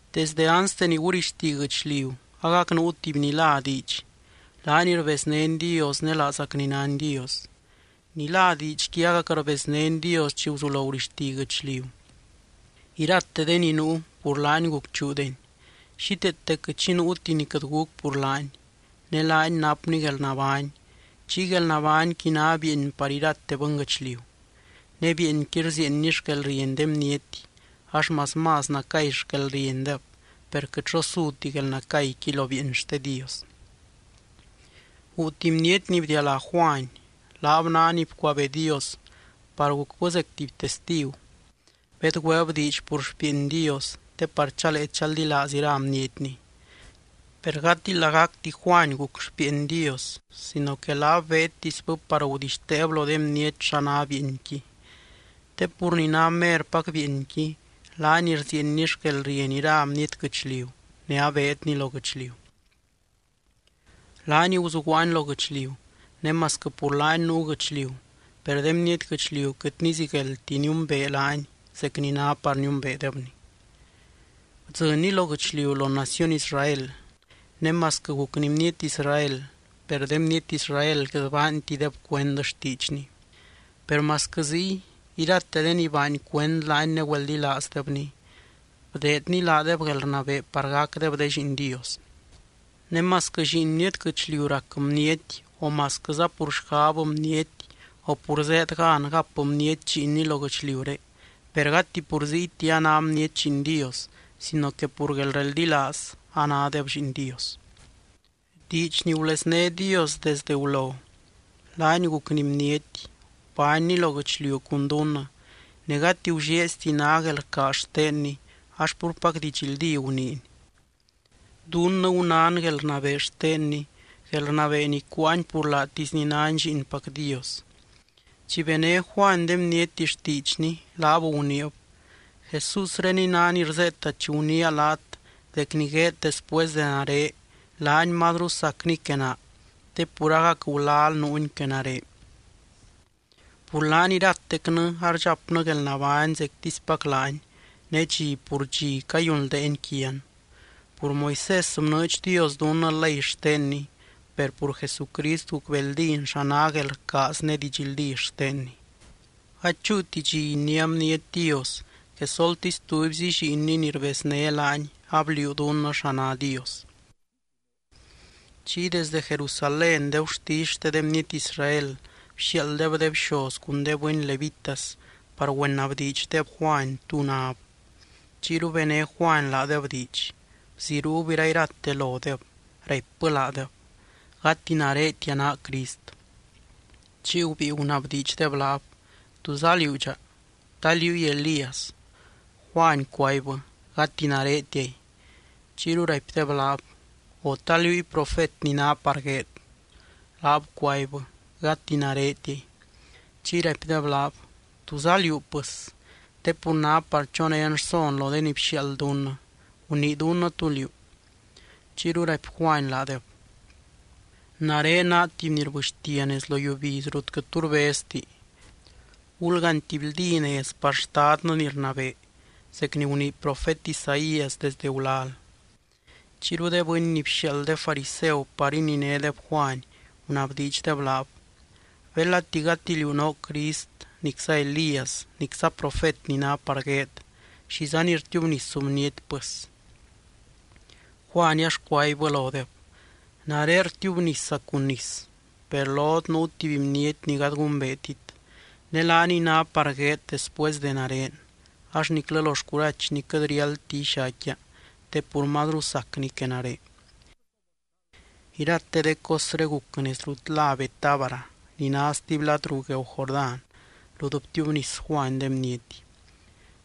Desde anste ni gurixti guɨchliu agac nuu tuby ni lá Diidx. Laany rbeznény Dios ne laazacny nány Dios. Ni lá Diidxqui agac rbeznény Dios chi guzulo gurixti guɨchliu. Irate de ni nuu, pur laany gucchuudeni. Xíteete quɨt xi nuuti ni quɨt guc pur laany. Ne laany napny guelnabány. Chiy guelnabányqui ná bieeny par irate bɨnguɨchliu. Ne bieenqui rzieenny xquelrieny de bniety ax más, más nacay xquelriendeb, per quɨt xo suti guelnacayqui lo bieeny xte Dios. Guu tuby bniety ni bdialá Juany. Laab ná ni bcuabee Dios par gucbɨ zec tuby testigu. Bedgüeeb diidx pur xpieeny Dios te par chalee chaldilaaz ira bnietny. Per gati lagacti Juany guc xpieeny Dios sino que laab beedtisbɨ par gudixteeb lo de bniety xa ná bieenqui. Te pur ni ná merpac bieenqui laany rzieenny xquelrieny ira bniety guɨchliu ne abeedny lo guɨchliu. Laany guzuguaany lo guɨchliu, ne masquɨ pur laany nuu guɨchliu, per de bniety guɨchliu quɨt nizigueldti niumbee laany zec ni ná par niumbeedebny. Bdzɨnny lo guɨchliu lo naciony Israel ne masquɨ gucny bniety Israel, per de bniety Israel quɨt baantideb cuend xtiidxny. Per masquɨ ziy, irate de ni baany cuend laany ne güeldilaazdebny, bdeedny laadeb guelrnabee par gacdeb de lliin Dios. Ne masquɨ lliin bniety guɨchliu rac bniety o masquɨza pur xgab bniety o pur zéed gan gap bniety lliinni lo guɨchliuré, per gati pur ziyti a ná bniety lliin Dios sino que pur guelreldilaaz anádeb lliin Dios. Diidx ni gulezné Dios desdɨ gulo, laany gucny bniety. Gubánny lo guɨchliu cun dunnɨ, ne gati gullieezti ná guelrcaaz xtenny ax púrpac didxldí guniiny. (Dunnɨ gunán guelrnabee xtenny, guelrnabee ni cuáany pur laatisny nány Lliinpac Dios.) Chi bené Juany de bniety xtiidxny, laab guniib: —Jesúsreniy ná ni rzeeta chi guniia laat dec ni gueed después de nare laany mazru sacny que naa te pur agac gulal nuuny que nare. Pur laany iratecnɨ ardxapnɨ guelnabány zectispac laany, ne dxi pur dxi cayunldeeny quian. Pur Moisés bnɨɨdx Dios dunnɨ ley xtenny, per pur Jesucrist gucbeeldín xa ná guelrcaaz ne didxldí xtenny. Gady chúuti dxi iniá bniety Dios, quesoltisy tubyzi Lliinny ni rbezné laany abliuu dunnɨ xa ná Dios. Chiy desde Jerusalén de gurtisy xte de bniety Israel bxiaalddeb de bxoz cun de bɨny levitas par güenabdiidxdeb Juany tú náb. Chiyru bené Juany laadeb diidx. Bziruub irairate lodeb raipbɨ laadeb: —Gati naretia naa Crist. Chiy gubíi gunabdiidxdeb laab: —¿Túza liú dxa? ¿Ta liúy Elías? Juany cuaibbɨ: —Gati naretiay. Chiyru raipdeb laab: —O, ¿ta liúy profet ni ná par gueed? Laab cuaibbɨ: —Gati naretiay. Chiy raipdeb laab: —¿Túza liú, pɨs? Te pur ná par chonén rson lo de ni bxiaald dunnɨ. Gunii dunnɨ tú liú. Chiyru raipy Juany laadeb: —Nare naa tuby ni rbɨxtia nez lo yiubiz rut quɨt tu rbezti: “Gulgaany tuby ldí nez par Xtadnɨ ni rnabee”, zec ni gunii profet Isaías desdɨ gulal. Chiyru de bɨny ni bxiaald de fariseu par ininédeb Juany, gunabdiidxdeb laab: —Belati gati liú noo Crist nicza Elías, nicza profet ni ná par gueed, ¿xizani rtiubnisu bniety pɨs? Juany ax cuaibbɨ lodeb: —Nare rtiubnisa cun nis. Per lot nuu tuby bniety ni gady gumbeetit. Ne laaniy ná par gueed después de nare, ax niclɨ lo xcurachny quɨt riáldti ixaicquia te pur mazru sacny que nare. Irate de cosré guc nez rut lá Betábara, ni ná stuby lad ruu gueeu Jordán rut btiubnis Juany de bniety.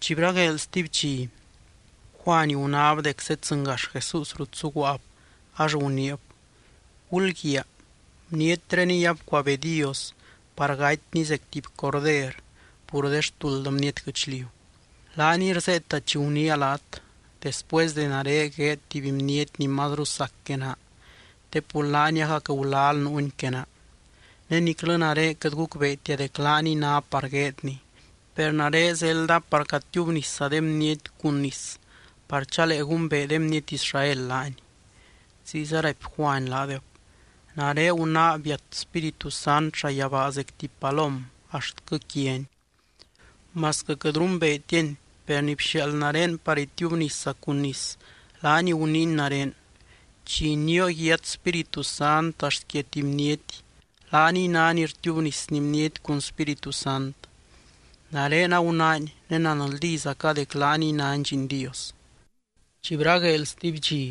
Chi bragueel stuby dxi, Juany gunáb dec zedzɨngax Jesús rut zuguaab, ax guniib: —Gulguiaa. Bnietreniy abcuabee Dios par gatyny zec tuby Corder pur de xtuld bniety guɨchliu. Laaniy rzeeta chi guniia laat: “Después de nare gueed tuby bniety ni mazru sac que naa, te pur laany agac gulal nuuny que naa.” Ne niclɨ nare quɨt gucbeetia dec laaniy ná par gueedny, per nare zelda par catiubnisa de bniety cun nis par chalee gumbee de bniety Israel laany. Ziyza raipy Juany laadeb: —Nare gunáa biat Spíritu Sant llayabaa zec tuby palom axtquɨ quiany. Masquɨ quɨt rumbeetiany, per ni bxiaald nare par itiubnisa cun nis laany guniiny nare: “Chi inioo yiat Spíritu Sant axt quia tuby bniety, laaniy ná ni rtiubnisny bniety cun Spíritu Sant.” Nare agunáany, ne nanldízaca dec laany nány Lliin Dios. Chi bragueel stuby dxi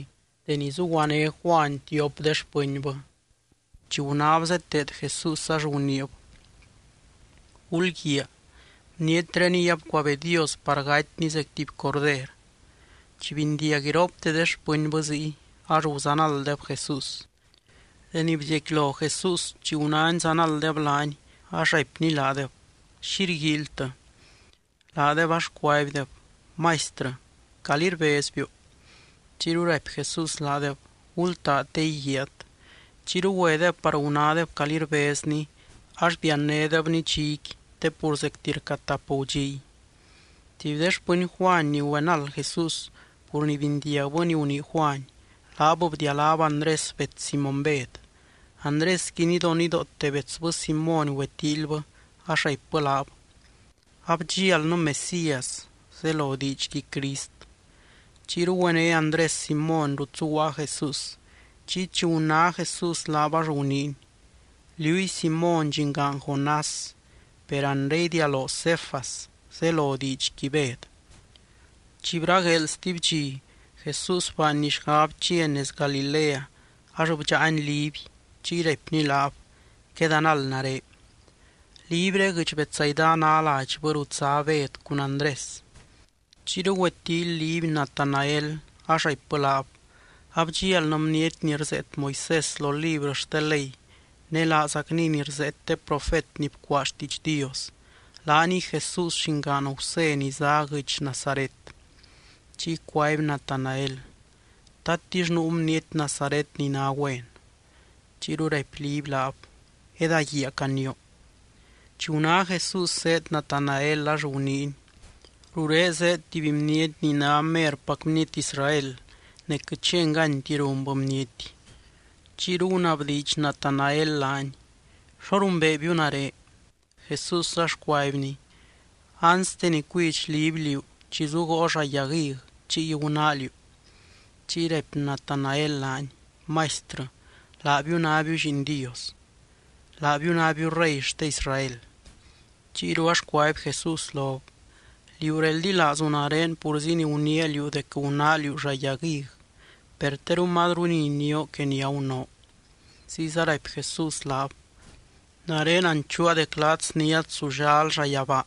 deni zuguané Juany tiop de xpɨnbɨ, chi gunáb zeteed Jesús, ax guniib: —Gulguiaa. Bnietreniy abcuabee Dios par gatyny zec tuby Corder. Chi bindiag iropte de xpɨnbɨ ziy, ax guzanalddeb Jesús. Deni bziecquilo Jesús, chi gunány zanalddeb laany, ax raipny laadeb: —¿Xi rguíilytɨ? Laadeb ax cuaibdeb: —Maistrɨ, ¿calí rbezbiu? Chiyru raipy Jesús laadeb: —Gultaa te íguiaat. Chiyru güedeb par gunádeb calí rbezny, ax biannédebny dxiqui, te pur zecti rca tap gudxiy. Tuby de xpɨny Juany ni güenald Jesús, pur ni bindiagbɨ ni gunii Juany, laab bdialáb Andrés bets Simóny Bed. Andrésqui nidonidoote betsbɨ Simóny güetíilybɨ ax raipbɨ laab: —Abdxialnɨ Mesías (zelo diidxqui, Crist). Chiyru güené Andrés Simóny rut zuguaa Jesús chiy chi guná Jesús laab ax guniiny: —Liúy Simóny, llingaan Jonás, per anre idialoo Cefas (zelo diidxqui, Bed). Chi bragueel stuby dxi Jesús baanny xgab chiany nez Galilea ax bdxáany Liby. Chiy raipny laab: —Quedanald nare. Libyré guɨdx Betsaida ná ladxbɨ rut zá Bed cun Andrés. Chiyru güetíily Liby Natanael, ax raipbɨ laab: —Abdxialnɨ bniety ni rzeet Moisés lo librɨ xte ley, ne laazacniy ni rzeet de profet ni bcuaa xtiidx Dios. Laaniy Jesús llingaan Gusé ni zá guɨdx Nazaret. Chiy cuaby Natanael: —¿Tatix nuu bniety Nazaret ni ná güen? Chiyru raipy Liby laab: —Edaguiaa canioo. Chi guná Jesús zéed Natanael, ax guniiny: —Rurén zéed tuby bniety ni ná merpac bniety Israel. Ne quɨt xi enganyti runbɨ bniety. Chiyru gunabdiidx Natanael laany: —¿Xo rumbeebiu nare? Jesús ax cuaibny: —Anste ni cuidx Liby liú, chi zugoo llaa yag hig, chiy gunáa liú. Chiy raipy Natanael laany: —Maistrɨ, laabiu nábiu Lliin Dios. Laabiu nábiu Rey xte Israel. Chiyru ax cuaby Jesús lob: —Liú reldilaazu nare purzi ni guniia liú dec gunáa liú llaa yag hig. Per teru mazru ni inioo que ni agunoo. Ziyza raipy Jesús laab: —Nare nanchuua dec laat sniát zullal llayabaa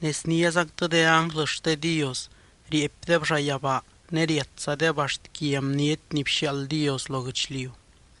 ne sniázactɨ de ánglɨ xte Dios rieepdeb llayabaa ne riatzadeb axt quia Bniety ni bxiaald Dios lo guɨchliu.